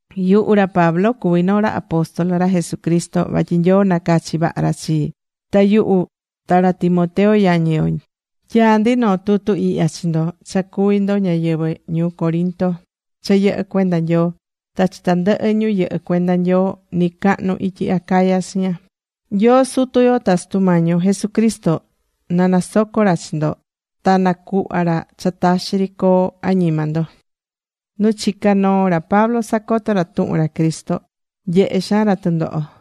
Yuhu ra Pablo, cuví noo ra apóstol ra Jesucristo vatyi Nyoo nacachi̱ vaha ra chii. Ta yuhu ta ra Timoteo yañi yo tyaá ndi noo tutu ihya chi ndo cha cuví ndo ñáyɨvɨ ñuu Corinto cha yɨhɨ́ cuenda Nyoo, ta chi tandɨhɨ ñu yɨhɨ́ cuenda Nyoo nɨcacahnu ityi Acaya chiña. Nyoo Sutu yo ta Sutu Mañi yo Jesucristo na nasoco ra chi ndo ta nacuhva ra cha taxi ri coo añima ndo.Nu chicá noo ra Pablo sacotó ra tuhun ra Cristo nyehé xaan ra tɨndoho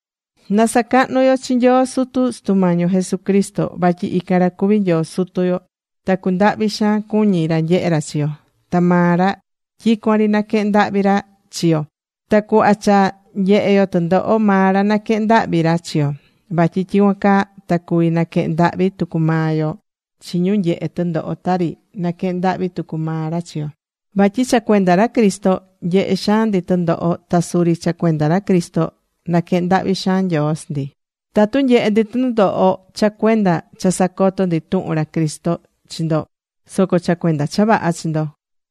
Na sacahnu yo chi Nyoo Sutu Sutu Mañi yo Jesucristo. Vatyi ican ra cuví Nyoo Sutu yo. Ta cundahvi xaan cuñi ra nyehé ra chi yo. Ta maa ra tyicuan ri naquehén ndahvi ra chi yo. Ta cuhva cha nyehé yo tɨndoho maa ra naquehén ndahvi ra chi yo. Vatyi tyicuan caa ta cuvi naquehen ndahvi tucu maa yo chi ñu nyehé tɨndoho tari naquehén ndahvi tucu maa ra chi yo. Vatyi cha cuenda ra Cristo, nyehé xaan ndi tɨndoho ta suri cha cuenda ra Cristo naquehén ndahvi xaan Nyoo chi ndi. Tatu nyehé ndi tɨndoho cha cuenda cha sacoto̱ ndi tuhun ra Cristo chi ndo, soco cha cuenda cha vaha chi ndo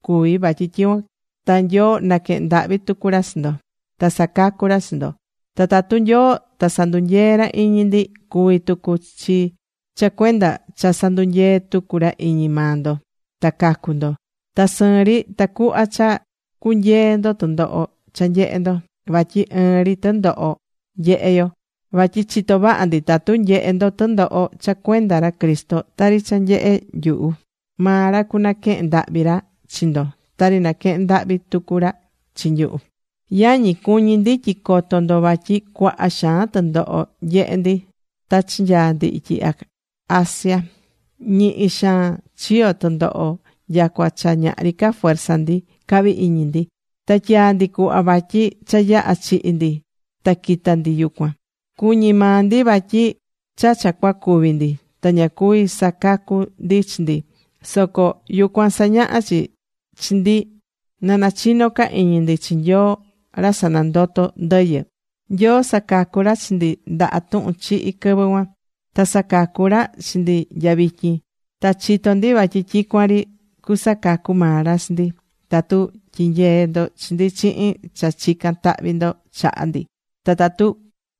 cuví vatyi tyicuan ta Nyoo naquehen ndahvi tucu ra chi ndo, ta sacacu ra chi ndo. Ta tatu Nyoo ta sandunyeé ra iñi ndi, cuví tucu chi cha cuenda cha sandunyeé tucu ra iñi maa ndo ta cacu ndo, ta sɨɨn ri tacuhva cha cunyeé ndo tɨndoho cha nyehé ndo. Vatyi ɨɨn ri tɨndoho nyehé yo. Vatyi chitó vaha ndi tatu nyehé ndo tɨndoho cha cuenda ra Cristo tari cha nyehé nyuhu, maa ra cunaquehen ndahvi ra chi ndo, tari naquehén ndahvi tucu ra chi nyuhu. Yañi, cuñí ndi tyi coto ndo vatyi cuaha xaan tɨndoho nyehe̱ ndi ta chinyaa̱ ndi ityi Asia. Ñihi xaan chiyo̱ tɨndoho nyacua cha ñahri ca fuerza ndi cahvi̱ iñi ndi. Ta tyaa̱ ndi cuhva vatyi cha yaha̱ chihi̱ ndi ta quita ndi yucuan. Cuñi̱ maa ndi vatyi cha cha cuacúvi ndi. Ta ña cuvi̱ sacacu ndi chi ndi. Soco yucuan sañaha̱ chi chi ndi na nachinó ca iñi ndi chi Nyoo ra sanandotó ndɨyɨ. Nyoo sacacu̱ ra chi ndi ndaha tuhun chihi quɨvɨ cuan, ta sacacú ca ra chi ndi nya vityin. Ta chitó ndi vatyi tyicuan ri cusacacu maa ra chi ndi. Tatu tyinyeé ndo chi ndi chihin cha chicán tahvi ndo chaha ndi, ta tatu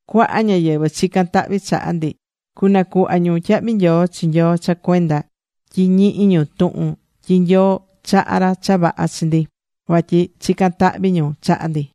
cuaha ñáyɨvɨ chicán tahvi chaha ndi, cunacuhva ñu tyahvi nyoo chi Nyoo cha cuenda tyi ñihí ñu tuhun tyi Nyoo chahá ra cha vaha chi ndi, vatyi chicán tahvi ñu chaha ndi.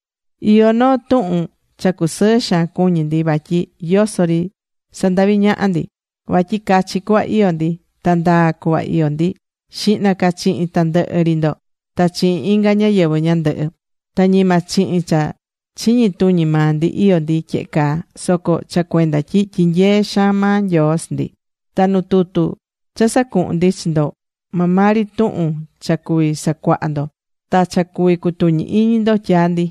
Iyó noo tuhun cha cusɨɨ xaan cuñí ndi, vatyi yoso ri sandaví ñaha ndi. Vatyi cachi cuhva iyó ndi. Ta ndaa cuhva iyó ndi xihna ca chihin tandɨhɨ ri ndo, ta chihin inga ñáyɨvɨ ñandɨhɨ. Ta ñima chihin cha chiñi tuñi maa ndi iyó ndi tyehe caa, soco cha cuenda tyi tyinyeé xaan maa Nyoo chi ndi. Ta nu tutu cha sacuhún ndi chi ndo, maa maa ri tuhun cha cuví sacuaha ndo, ta cha cuví cutuñi iñi ndo, tyaá ndi.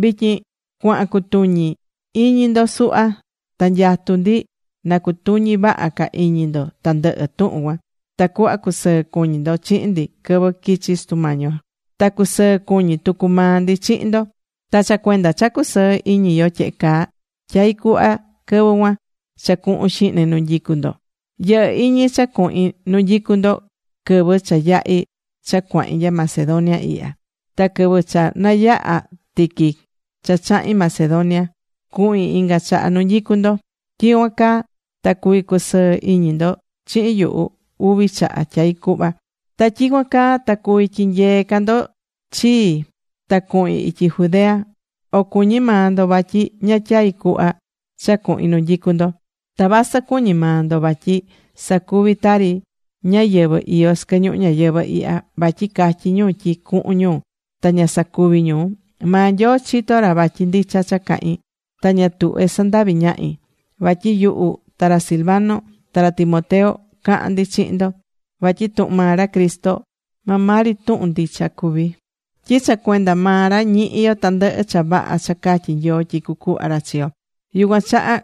Vityin cuahán cutuñi iñi ndo suhva. Ta nyatú ndi na cutuñi vaha ca iñi ndo tandɨhɨ tuhun cuan. Tacuhva cusɨɨ cuñi ndo chihin ndi quɨvɨ quichi Sutu Mañi yo. Ta cusɨɨ cuñi tucu maa ndi chihin ndo. Ta cha cuenda cha cusɨɨ́ iñi yo tyehe caa, tyai̱ cuhva quɨvɨ cuan cha cuhun xihne nu nyicú ndo. Yɨhɨ̱ iñi cha cuhin nu nyicú ndo, quɨvɨ cha yahi̱ cha cuahín nya Macedonia ihya. Ta quɨvɨ cha nayaha̱ tiqui cha chahi̱n Macedonia, cuhin inga chaha nu nyicú ndo. Tyicuan caa ta cuvi cusɨɨ iñi ndo chihin yuhu uvi chaha, tyai̱ cuhva. Ta tyicuan caa ta cuvi tyinyee ca ndo chii ta cuhin ityi Judea. O cuñí maa ndo vatyi ña tyai̱ cuhva cha cuhin nu nyicu ndo. Ta vasɨ cuñí maa ndo vatyi sacuví tari ñáyɨvɨ iyó sɨquɨ ñuhu ñayɨvɨ̱ ihya. Vatyi catyí ñu tyi cuhun ñu, ta ña sacuví ñu. Maa Nyoo chitó ra vatyi ndicha cha cahín. Ta ña tuhvé sandavi ñahi. Vatyi yuhu ta ra Silvano ta ra Timoteo cahán ndi chihin ndo. Vatyi tuhun maa ra Cristo maa maa ri tuhun ndicha cuví. Tyi cha cuenda maa ra ñihí yo tandɨhɨ cha vaha cha catyi̱ Nyoo tyi cucuhva ra chi yo. Yucuan chaha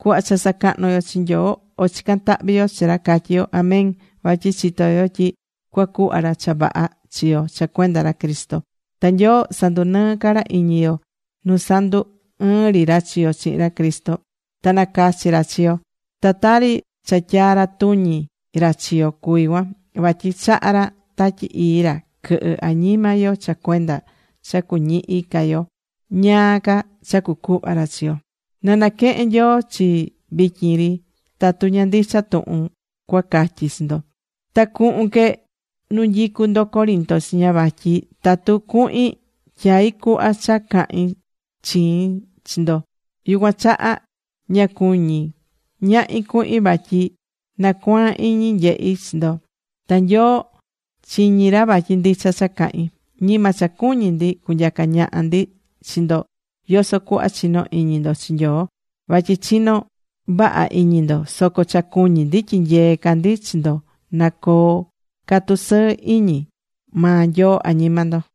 cuhva cha sacahnú yo chi Nyoo, o chicán tahvi yo chi ra, catyí yo: “Amén”. Vatyi chitó yo tyi cuacuhva ra cha vaha chi yo cha cuenda ra Cristo. Ta Nyoo sandunɨɨ́ ca ra iñi yo nu sandu ɨɨ̱n ri ra chi yo chihin ra Cristo. Ta nacachi̱ ra chi yo. Ta tari cha tyaa̱ ra tuñi ra chi yo cuví cuan. Vatyi chaha̱ ra Tatyi Ii ra quɨhɨ́ añima yo cha cuenda cha cuñihi ca yo ñáá ca cha cucuhva ra chi yo. Na naquehen Nyoo chii vityin ri tatu ña ndicha tuhun cua catyi chi ndo. Ta cuhun que nu nyicú ndo Corinto chiña vatyi tatu cuhin tyaí cuhva cha cahin chiin chi ndo. Yucuan chaha ña cuñí ñahi cuhin vatyi nacuaan iñi nyehí chi ndo. Ta Nyoo chiñí ra vatyi ndicha cha cahín. Ñima cha cuñí ndi cunyaca ñaha ndi chi ndo yoso cuhva chinó iñi ndo chi Nyoo. Vatyi chinó vaha iñi ndo. Soco cha cuñí ndi tyinyeé ca ndi chi ndo na coo ca tusɨɨ iñi maa Nyoo añima ndo.